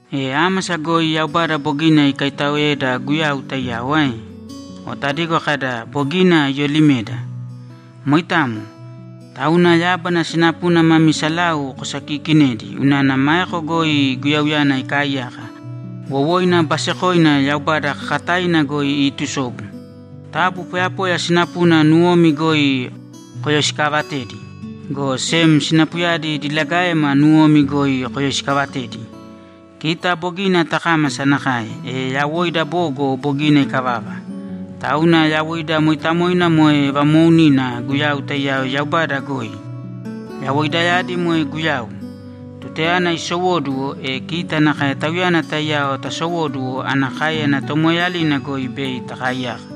E ámasa goi Yaubada bogina ikaitaoeda Guyau taiyao ae? O tadigo kada, ‘Bogina iyolimeda.’ Moitamo. Tauna yábana sinapuna mami salau kosokiikinēdi unana maeko goi Guyauyana ikaaiyaka, wowoina basekoina Yaubada kakataina goi iitusobu. Taabu poyapoya sinapuna nuwomi goi koyoisikaavatēdi, go sem sinapuyadi diligaema nuwomi goi koyoisikaavatēdi. Kita bogina takámasa nakae, e yawoida bogo bogina ikavava. Tauna yawoida mooitamoina moe vamoounina Guyau taiyao Yaubada goi. Yawoidayadi moe Guyau. Tutayana isowóduwo, e kita nakae Tauyana taiyao tasowóduwo ana káeyana tomoeeyalina goi bei takaaiyaka.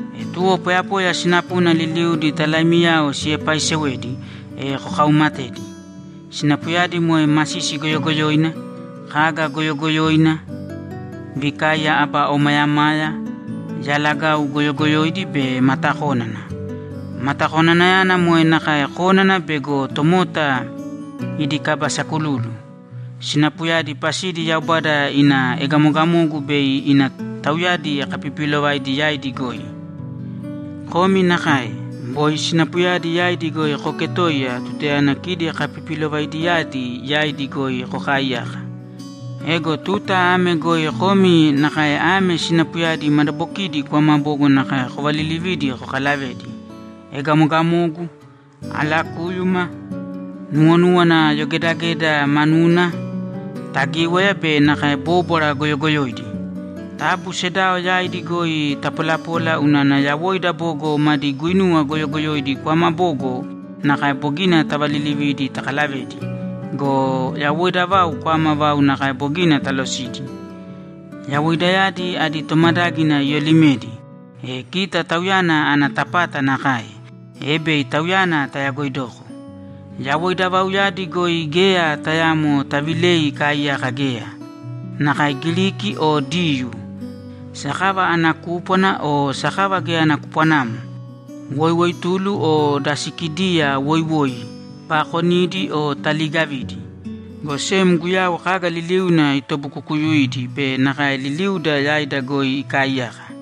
E tuwo poyapoya sinapuna liliudi talaimiyao siepaaisewedi, e kokauumatēdi. Sinapuyadi moe masisi goyogoyoina, kaga goyogoyoina, vikaiya aba omayamaya, yalagau goyogoyoidi be matakónana. Matakonanayana moe nakae kónana bego tomota idi kaba sakululu. Sinapuyadi pasidi Yaubada ina egamogamogu bei ina tauyadi kapipiilovaidi yaidi goi. Komi nakae, boi sinapuyadi yaidi goi kooketoiya tutayana kidi kapipilovaidiyadi yaidi goi kokaaiyaka. Ego tuta ame goi komi nakae ame sinapuyadi madabokidi kwama bogo nakae kovalilivīdi kokalavēdi: Egamogamogu, alakúyuma, nuwonúwana yogedageda manuna, tagíwaya be nakae bóbwara goyogoyoidi. Taabu sedao yaidi goi tapolapōla unana yawoida bogo madi guuinuwa goyogoyoidi kwama bogo nakae bogina tavalilividi takalavedi go, yawoida vau kwama vau nakae bogina talosidi. Yawoidayadi adi tomadágina iyoolimedi, e kita Tauyana ana tapata nakae, e bei Tauyana tayagoidoko. Yawoida vauyadi goi geya tayaamo tavilei ikaaiyaka geya. Nakae Giriki o Diyuu, sakava ana kúpwana o sakava geya ana kupwanamo, woiwoitulu o da Sikidiya woiwoi, paakonidi o taliigavidi. Go sem Guyau kaga liliuna itobukukuyuidi be nakae liliuda yaida goi ikaaiyaka.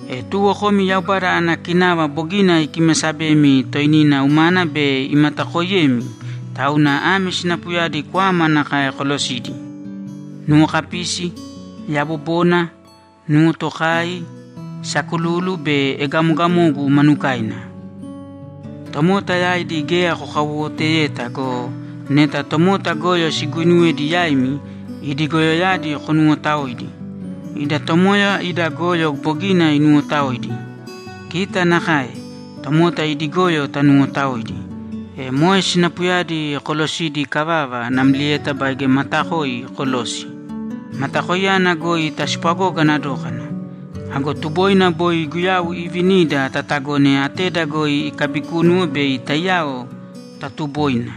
E tuwo komi Yaubada ana kinava bogina ikimasabemi toinina umana be imatakooiyemi, tauna ame sinapuyadi kwama nakae kolosīdi: Nuwokapisi, yabobona, nuwotokai, sakululu be egamogamogu manukaina. Tomota yaidi geya kokawowoteyeta go, neta tomota goyo siguinuwedi yaimi, idi goyoyadi konuwotaōidi. Ida Tomoya ida goyo bogina inuwotaoidi. Kita nakae, tomota idi goyo tanuwotaōidi. E moe sinapuyadi kolosidi ikavava, namlieta baige matakoi kolōsi. Matakoiyana goi taspwagogana dókana. Ago tuboina boi Guyau iivinida tatagōne ateda goi ikaabikúnuwo bei taiyao taatuboina.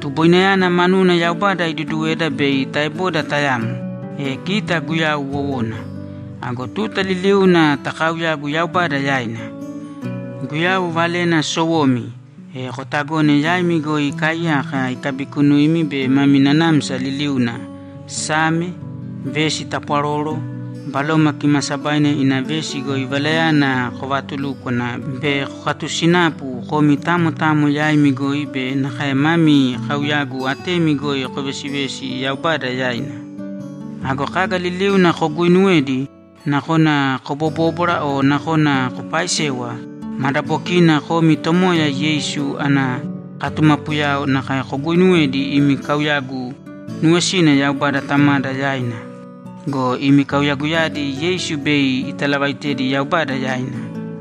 Tuboinayana manuna Yaubada iduduweda bei taeboda tayamo, e kita Guyau wowona. Ago tuta liliuna takaauyāgu Yaubada yaina. Guyau valena sowomi, e kotagōne yaimi goi ikaaiyaka ikabikunuimi be mami nanamsa liliuna Same, vesi tapwaroro, Baloma Kimaasabaina ina vesi goi valayana kovatulūkwana be kokatusināpu komi tamo tamo yaimi goi be nakae mami kaauyagu atemi goi kovesivēsi Yaubada yaina. Ago kaga liliuna koguuinuwedi, nakona kobobóbwara o nakona kopaaisewa, madabokiina komi Tomoya Yeisu ana katumapuyao nakae koguuinuwēdi imi kauyagu nuwesina Yaubada Tamada yaina go, imi kauyaguyadi Yeisu bei italavaitedi Yaubada yaina.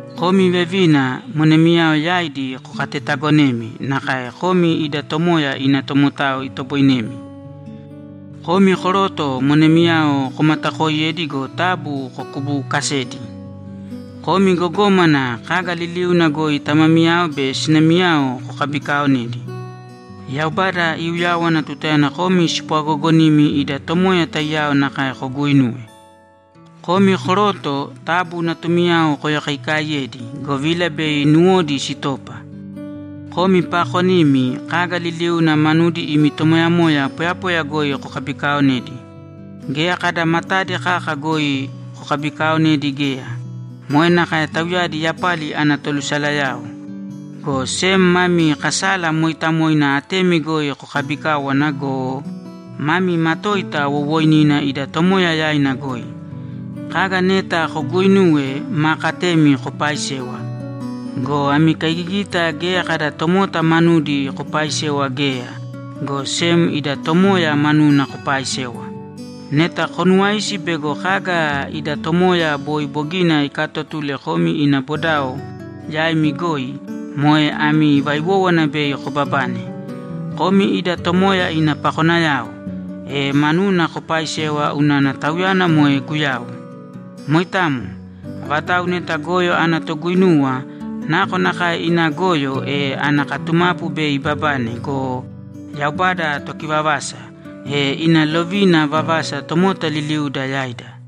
Komi vevina, monemiyao yaidi kokatetaagonēmi nakae komi ida Tomoya ina tomotao itoboinemi. Komi koroto, monemiyao komatakooiyēdi go, taabu kokubuukasēdi. Komi gogómana, kaga liliuna goi tamamiyao be sinamiyao kokabikaaonēdi. Yaubada iuyáwana tutayana komi spwagoogonimi ida Tomoya taiyao nakae koguuinuwe. Komi koroto, taabu natumiyao koyokaikaaiyēdi, govila bei nuwodi sitopa. Komi paakonimi, kaga liliuna manudi imi tomoyamoya poyapoya goi kokabikaaonēdi. Geya kada matadi kaka goi kokabikaaonēdi geya. Moe nakae tauyadi yapali ana tolusalayao. Go sem mami kasala mooitamoina atemi goi kokaabikāwana go, mami matoita wowooinina ida Tomoya yaina goi. Kaga neta koguuinuwe, maa katemi kopaaisēwa go, ami kaigigita geya kada tomota manudi kopaaisewa geya, go sem ida Tomoya manuna kopaaisewa. Neta konuwaisi bego kaga ida Tomoya boi bogina ikaatotule komi ina bodao yaimi goi, moe ami vaiwówana bei kobabane. Komi ida Tomoya ina pakonayao, e manuna kopaaisēwa unana Tauyana moe Guyau. Moitamo. Avatau neta goyo ana toguinuwa, nakonakae ina goyo, e ana katumapu bei ibabane go, Yaubada Tokivavasa, e ina lovina vavasa tomota liliuda yaida.